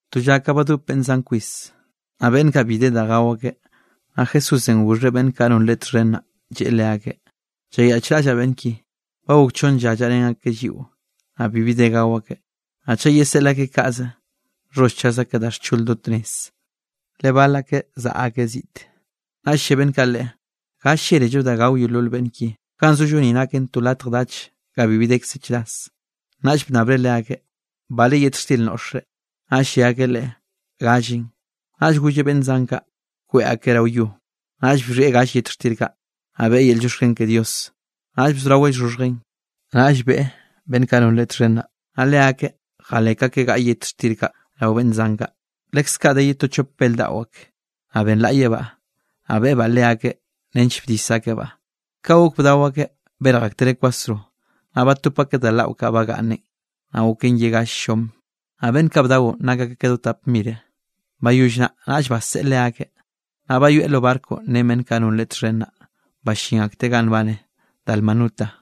To lla ka badop beꞌnn zan kwis, naꞌ beꞌnn kaꞌ bi de da gao akeꞌ, naꞌ Jesúsenꞌ goxheꞌ beꞌnn kaꞌ non Leꞌe txhen naꞌ, lleꞌe leakeꞌ: —Llayaꞌchraꞌllaꞌ beꞌnn ki, ba gok chonn lla llaꞌrén akeꞌ lliꞌo, naꞌ bibi de gao akeꞌ. Naꞌ chaꞌ yeseꞌl akeꞌ kaꞌze, nxholl chaz akeꞌ da xchol do tnez, le bal akeꞌ zaꞌa akeꞌ ziꞌte. Naꞌll lle beꞌnn kaꞌ Leꞌe: —¿Ga llélello da gao yeolol beꞌnn ki? Ganꞌ zollo ni naken to latj dach ga bibi dekze chras. Naꞌll bnnabreꞌ leakeꞌ: —¿Bale yet xtir noꞌxre? Naꞌll lle akeꞌ Leꞌe: —Gallen. Naꞌll golleꞌ beꞌnn zan kaꞌ kweꞌ akeꞌ rao yo, naꞌll bxhieꞌ gall yet xtir kaꞌ, naꞌ beꞌe yel llioxken ke Dios; naꞌll bzoraweꞌ llxhoxhjen, naꞌll beꞌe beꞌnn kaꞌ non Leꞌe txhen naꞌ, naꞌ leakeꞌ jalek akeꞌ gaꞌa yet xtir kaꞌ rao beꞌnn zan kaꞌ. Leskaꞌ de ye to chop bel daꞌo ak, naꞌ benlaꞌyebaꞌ, naꞌ beꞌebaꞌ leakeꞌ nench bdis akebaꞌ. Ka gok bdao akeꞌ, berj aktereꞌ kwasro, naꞌ batop akeꞌ da laꞌo kaꞌ bagaꞌnne, naꞌ goken ye gall llom. Naꞌ beꞌnn kaꞌ bdaonꞌ, nak akeꞌ ka do tap mire. Bayoll naꞌ, naꞌll baseꞌe leakeꞌ. Naꞌ bayoeꞌ lo barco ren beꞌnn kaꞌ non Leꞌe txhen naꞌ, ballín akteꞌ ganꞌ nbane Dalmanuta.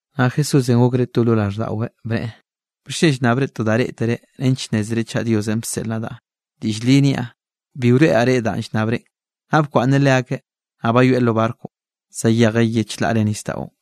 Naꞌ Jesúsenꞌ gokreꞌ to lo raꞌlldaꞌweꞌ, bneꞌe: —¿Bixchen llnnabre to da reꞌtere nench nnézere chaꞌ Diosenꞌ bseꞌl nadaꞌ? Diꞌll li niaꞌ, bi wroeꞌraꞌ reꞌ danꞌ llnnabrenꞌ. Naꞌ bkwaꞌnneꞌ leakeꞌ, naꞌ bayoeꞌ lo barconꞌ zayejeꞌ ye chlaꞌre nisdaꞌon.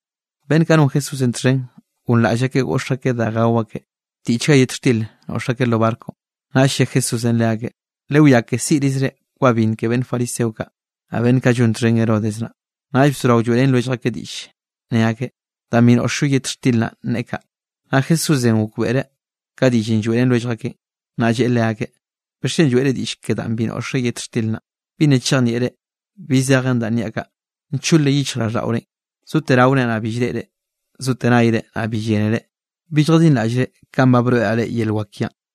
Beꞌnn kaꞌ non Jesúsenꞌ txhen gonraꞌll akeꞌ goꞌx akeꞌ da gao akeꞌ, tiꞌchga yet xtir noꞌx akeꞌ lo barconꞌ. Naꞌll lle Jesúsenꞌ leakeꞌ: —Lewiá ke siꞌrizre kwa binn ke beꞌnn fariseo kaꞌ, naꞌ beꞌnn kaꞌ llon txhen Herodes naꞌ. Naꞌll bzorao lloeꞌrén lwellj akeꞌ diꞌll, ne akeꞌ: —Danꞌ bi noꞌxllo yet xtir naꞌn neꞌe kaꞌ. Naꞌ Jesúsenꞌ gokbeꞌreꞌ ka diꞌllenꞌ lloeꞌrén lwellj akeꞌn, naꞌ lleꞌe leakeꞌ: —¿Bixchen lloeꞌre diꞌll ke danꞌ bi noꞌxre yet xtir naꞌ? ¿Bi nna chejnieꞌre bi zejen danꞌ niaꞌ kaꞌ? ¿Nchole yichjraꞌlldaꞌorenꞌ? ¿Zote raore, naꞌ bi llreꞌre? ¿Zote nayre, naꞌ bi llénere? ¿Bi lljadinraꞌllre kanꞌ ba broeꞌraꞌ reꞌ yel wak kiaꞌn?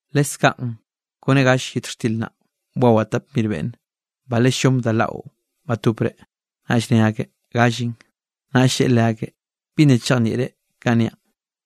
—Leskaꞌn kone gall yet xtir naꞌ, bwawaꞌ tap mir beꞌnne. ¿Bale llom da laꞌo batopre? Naꞌll ne akeꞌ: —Gallen. Naꞌll lleꞌe leakeꞌ: —¿Bi nna chejnieꞌre kanꞌ niaꞌ?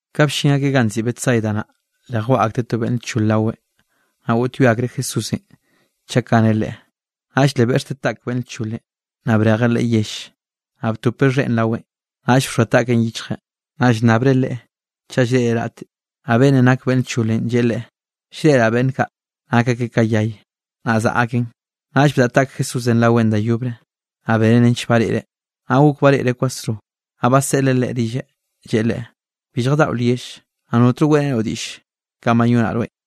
Ka bllin akeꞌ ganꞌ nziꞌi Betsaida naꞌ, le jwaꞌa akteꞌ to beꞌnn lchole raweꞌn, naꞌ goꞌtyoe akreꞌ Jesúsenꞌ chaꞌ kaneꞌ leꞌe. Naꞌll le beꞌxteꞌ taꞌk beꞌnn lcholenꞌ, naꞌ brejeꞌ leꞌe yell. Naꞌ btopeꞌ xheꞌn raweꞌn, naꞌll bxoa taꞌkeꞌn yichjeꞌ, naꞌ llnnabreꞌ leꞌe chaꞌ llreꞌreꞌ raꞌte. Naꞌ beꞌnnenꞌ nak beꞌnn lcholenꞌ lleꞌe Leꞌe: —Llreꞌraꞌ beꞌnn kaꞌ nak akeꞌ ka yay, naꞌ zaꞌa akeꞌn. Naꞌll bdaꞌa taꞌk Jesúsenꞌ raweꞌn da yobre, naꞌ beneꞌ nench bareꞌreꞌ, naꞌ gok bareꞌreꞌ kwasro. Naꞌ baseꞌleꞌ leꞌe rilleꞌ, lleꞌe leꞌe: —Bi lljadaꞌo lyell, naꞌ notno weꞌrenoꞌ diꞌll kanꞌ bayonaꞌ rweꞌn.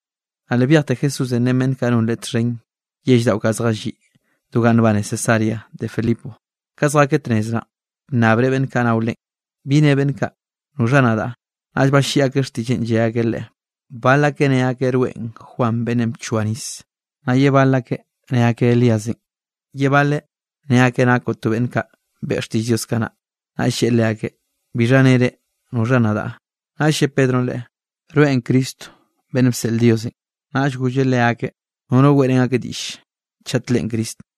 Naꞌ le byejte Jesúsenꞌ ren beꞌnn kaꞌ non Leꞌe txhen yell daꞌo kaꞌ zjalliꞌ do ganꞌ nbane Cesarea de Filipo. Ka zjakeꞌ tnez naꞌn, bnnabreꞌ beꞌnn kaꞌ nao Leꞌen: —¿Bi ne beꞌnn kaꞌ noxha nadaꞌ? Naꞌll balliꞌi akeꞌ xtiꞌlleꞌn lle akeꞌ Leꞌe: —Bal akeꞌ ne akeꞌ rweꞌn Juan beꞌnnenꞌ bchoa nis. Naꞌ ye bal akeꞌ ne akeꞌ Elíasenꞌ. Ye baleꞌ ne akeꞌ nakoꞌ to beꞌnn kaꞌ beꞌe xtiꞌll Diosenꞌ kanaꞌ. Naꞌll lleꞌe leakeꞌ: —¿Bixha ne reꞌ? ¿Noxha nadaꞌ? Naꞌll lle Pedronꞌ Leꞌe: —Rweꞌn Cristo beꞌnn bseꞌl Diosenꞌ. Naꞌll golleꞌ leakeꞌ, nono weꞌrén akeꞌ diꞌll chat Leꞌen Cristo.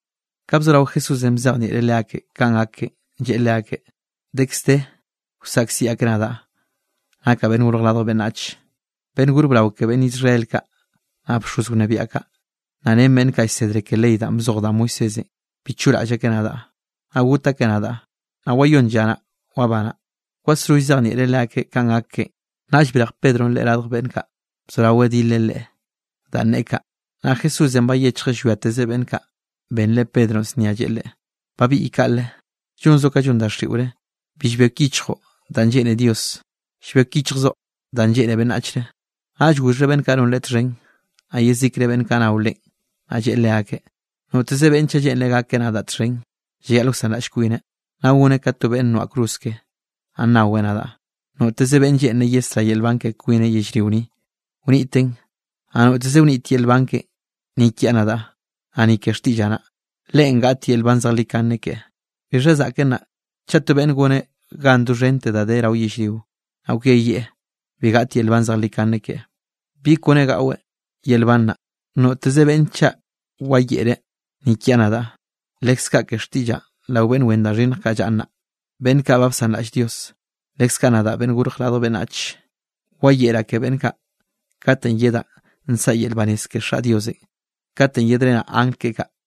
Ka bzorao Jesúsenꞌ bzejnieꞌreꞌ leakeꞌ kanꞌ gak keꞌen, lleꞌe leakeꞌ: —Dekz de wsaꞌkziꞌ akeꞌ nadaꞌ, nakaꞌ Beꞌnn Gorj Radj Beꞌnnach. Beꞌnn gor brao ke beꞌnn Israel kaꞌ, naꞌ bxoz wnebiaꞌ kaꞌ, naꞌ ren beꞌnn kaꞌ llsedre ke ley danꞌ bzoj da Moisésenꞌ, bi choꞌraꞌll akeꞌ nadaꞌ, naꞌ got akeꞌ nadaꞌ, naꞌ wayón lla naꞌ, wabanaꞌ. Kwasro llzejnieꞌreꞌ leakeꞌ kanꞌ gak keꞌen. Naꞌll brej Pedronꞌ Leꞌe radj beꞌnn kaꞌ, bzoraweꞌ dileꞌ Leꞌe danꞌ neꞌe kaꞌ. Naꞌ Jesúsenꞌ bayechjeꞌ llwiatezeꞌ beꞌnn kaꞌ, benreꞌ Pedronꞌ znia lleꞌe leꞌe: —¡Babiꞌy kaꞌle, llonzoꞌ ka llon daxiꞌore! Bi llbek yichjoꞌ danꞌ lleꞌne Dios, llbek yichjzoꞌ danꞌ lleꞌne beꞌnnachre. Naꞌll goxheꞌ beꞌnn kaꞌ non Leꞌe txhen, naꞌ yezikre beꞌnn kaꞌ nao Leꞌen, naꞌ lleꞌe leakeꞌ: —Noteze beꞌnne chaꞌ lleꞌnreꞌ gakeꞌ nadaꞌ txhen, llayaꞌl wsanraꞌll kwineꞌ, naꞌ goneꞌ ka to beꞌnn noaꞌ cruz keꞌe, naꞌ naweꞌ nadaꞌ. Noteze beꞌnn lleꞌnreꞌ yesrá yel nban ke kwineꞌ yellrio ni, wniteꞌn, naꞌ noteze wnit yel nban keꞌen ni kiaꞌ nadaꞌ, naꞌ ni ke xtiꞌllaꞌ naꞌ, leꞌen gaꞌt yel nban zejlikane keꞌe. ¿Bixha zaꞌken naꞌ, chaꞌ to beꞌnne goneꞌ gan doxhente da de rao yellrio, naꞌ kweyieꞌ, bi gaꞌt yel nban zejlikane keꞌe? ¿Bi kone gaꞌweꞌ yel nban naꞌ? Noteze beꞌnne chaꞌ wayeꞌreꞌ ni kiaꞌ nadaꞌ, leskaꞌ ke xtiꞌllaꞌn rao beꞌnn wen da xhinnj kaꞌ llaꞌa nnaꞌ, beꞌnn kaꞌ ba bsanraꞌll Dios, leskaꞌ nadaꞌ Beꞌnnenꞌ Gorj Radj Beꞌnnach, wayeꞌraꞌ ke beꞌnn kaꞌ katenꞌ yedaꞌ nsaꞌa yel banez ke Xaꞌ Diosenꞌ kate yedrenaꞌ angl keꞌe kaꞌ.